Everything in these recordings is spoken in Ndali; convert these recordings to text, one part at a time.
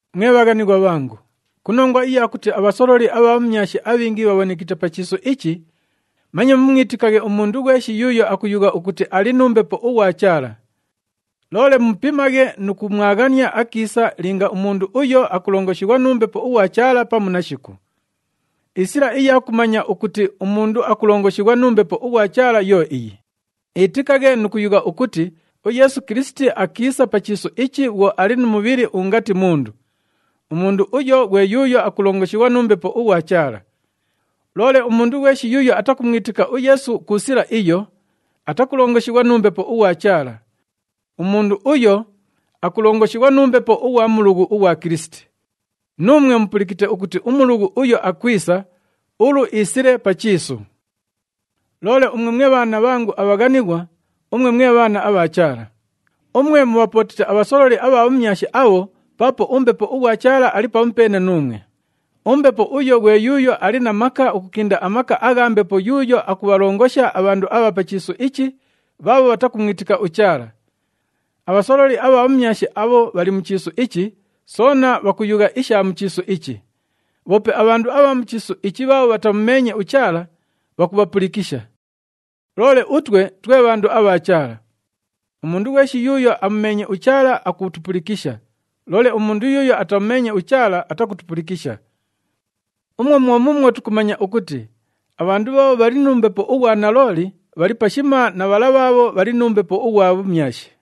Mwe bhaghanighwa bhangu, ku nongwa iya kuti abhasololi abha bhumyashi abhingi bhabhonekite pa chiisu ichi, manye mumwitikaghe umundu ghweshi yuuyo akuyugha ukuti ali nu Mbepo ughwa Chaala. Loole mupimaghe nu kumwaghania akiisa linga umundu uyo akulongoshighwa nu Mbepo ughwa Chaala pamu nashiku. Isila iya kumanya ukuti umundu akulongoshighwa nu Mbepo ughwa Chaala yo iyi, iitikaghe nu kuyugha ukuti uYeesu Kilisiti akiisa pa chiisu ichi bhwo ali nu mubhili ungati mundu. Umundu uyo ghwe yuuyo akulongoshighwa nu Mbepo ughwa Chaala. Loole umundu ghweshi yuuyo atakumwitika uYeesu ku sila iyo, atakulongoshighwa nu Mbepo ughwa Chaala. Umundu uyo akulongoshighwa nu mbepo ughwa mulughu ughwa Kilisiti. Nuumwe mupulikite ukuti umulughu uyo akwisa, ulu iisile pa chiisu. Loole umwe mwe bhaana bhangu abhaghanighwa, umwe mwe bhaana abha Chaala. Umwe mubhapootite abhasololi abha bhumyashi abho paapo uMbepo ughwa Chaala ali pamupeene nuumwe. UMbepo uyo ghwe yuuyo ali na maka ukukinda amaka agha mbepo yuuyo akubhalongosha abhandu abha pa chiisu ichi bhaabho bhatakumwitika uChaala. Abhasololi abha bhumyashi abho bhali mu chiisu ichi, soona bhakuyugha isha mu chiisu ichi. Bhoope abhandu abha mu chiisu ichi bhaabho bhatamumeenye uChaala, bhakubhapulikisha. Loole utwe twe bhandu abha Chaala. Umundu ghweshi yuuyo amumeenye uChaala akutupulikisha, loole umundu yuuyo atamumeenye uChaala atakutupulikisha. Umwo mwo muumwo tukumanya ukuti abhandu bhaabho bhali nu Mbepo ughwa nalooli, bhali pashima na bhala bhaabho bhali nu mbepo ughwa bhumyashi.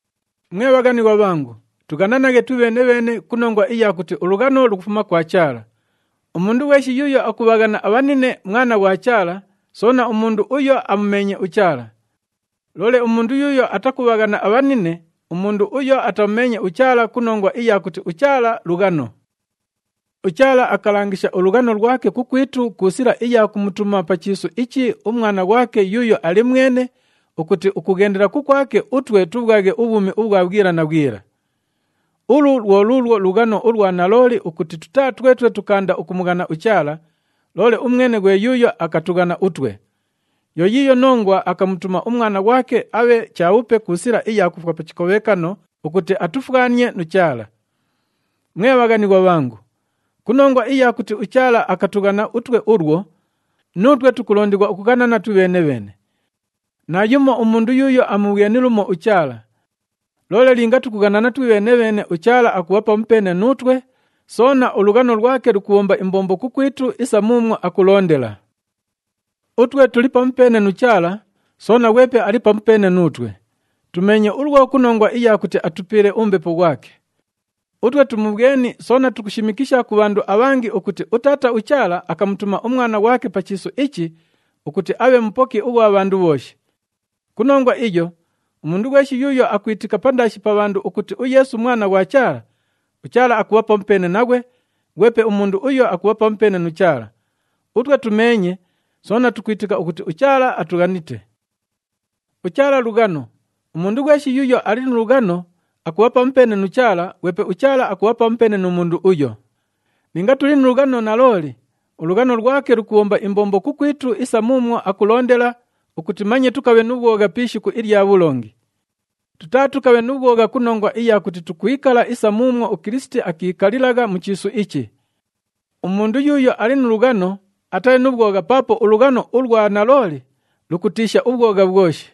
Mwe bhaghanighwa bhangu, tughananaghe twibheene-bheene ku nongwa iya kuti ulughano lukufuma kwa Chaala. Umundu ghweshi yuuyo akubhaghana abhanine, mwana ghwa Chaala, soona umundu uyo amumeenye uChaala. Loole umundu yuuyo atakubhaghana abhanine, umundu uyo atamumeenye uChaala ku nongwa iya kuti uChaala lughano. UChaala akalangisha ulughano lwake kukwitu ku sila iya kumutuma pa chiisu ichi uMwana ghwake yuuyo ali mwene, ukuti ukughendela kukwake, utwe tubhwaghe ubhwumi ubhwa bhwila na bhwila. Ulu lwo luulwo lughano ulwa nalooli ukuti tutaa twetwe tukaanda ukumughana uChaala, loole umwene ghwe yuuyo akatughana utwe. Yo yiiyo nongwa akamutuma uMwana ghwake abhe chabhupe ku sila iya kufwa pa chikobhekano ukuti atufwanie nu Chaala. Mwe bhaghanighwa bhangu, ku nongwa iya kuti uChaala akatughana utwe ulwo, nuutwe tukulondighwa ukughanana twibheene-bheene. Naayumo umundu yuuyo amubhweni lumo uChaala. Loole linga tukughanana twibheene-bheene, uChaala akubha pamupeene nuutwe, soona ulughano lwake lukubhomba imbombo kukwitu isa muumwo akulondela. Utwe tuli pamupeene nu Chaala, soona ghwepe ali pamupeene nuutwe. Tumeenye ulwo ku nongwa iya kuti atupiile uMbepo ghwake. Utwe tumubhweni soona tukushimikisha ku bhandu abhangi ukuti uTaata uChaala akamutuma uMwana ghwake pa chiisu ichi ukuti abhe Mupoki ughwa bhandu bhooshi. Ku nongwa iyo, umundu ghweshi yuuyo akwitika pandaashi pa bhandu ukuti uYeesu Mwana ghwa Chaala, uChaala akubha pamupeene naghwe, ghwepe umundu uyo akubha pamupeene nu Chaala. Utwe tumeenye, soona tukwitika ukuti uChaala atughanite. UChaala lughano. Umundu ghweshi yuuyo ali nu lughano, akubha pamupeene nu Chaala, ghwepe uChaala akubha pamupeene nu mundu uyo. Linga tuli nu lughano nalooli, ulughano lwake lukubhomba imbombo kukwitu isa muumwo akulondela ukuti manye tukabhe nu bhwogha pi ishiku ilya bhulongi. Tutaatukabhe nu bhwogha ku nongwa iya kuti tukwikala isa muumwo uKilisiti akiikalilagha mu chiisu ichi. Umundu yuuyo ali nu lughano, atali nu bhwogha paapo ulughano ulwa nalooli lukutiisha ubhwogha bhwoshi.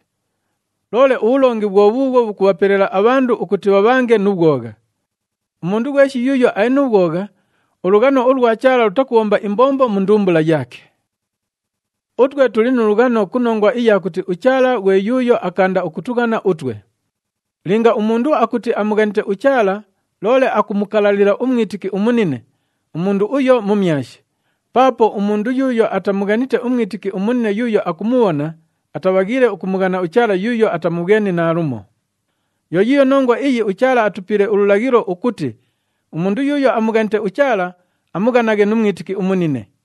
Loole ubhulongi bhwo bhuubhwo bhukubhapelela abhandu ukuti bhabhange nu bhwogha. Umundu ghweshi yuuyo ali nu bhwogha, ulughano ulwa Chaala lutakubhomba imbombo mu ndumbula yaake. Utwe tuli nu lughano ku nongwa iya kuti uChaala ghwe yuuyo akaanda ukutughana utwe. Linga umundu akuti amughanite uChaala loole akumukalalila umwitiki umunine, umundu uyo mumyashi. Paapo umundu yuuyo atamughanite umwitiki umunine yuuyo akumubhona, atabhaghiile ukumughana uChaala yuuyo atamubhweni naalumo. Yo yiiyo nongwa iyi uChaala atupiile ululaghilo ukuti umundu yuuyo amughanite uChaala, amughanaghe nu mwitiki umunine.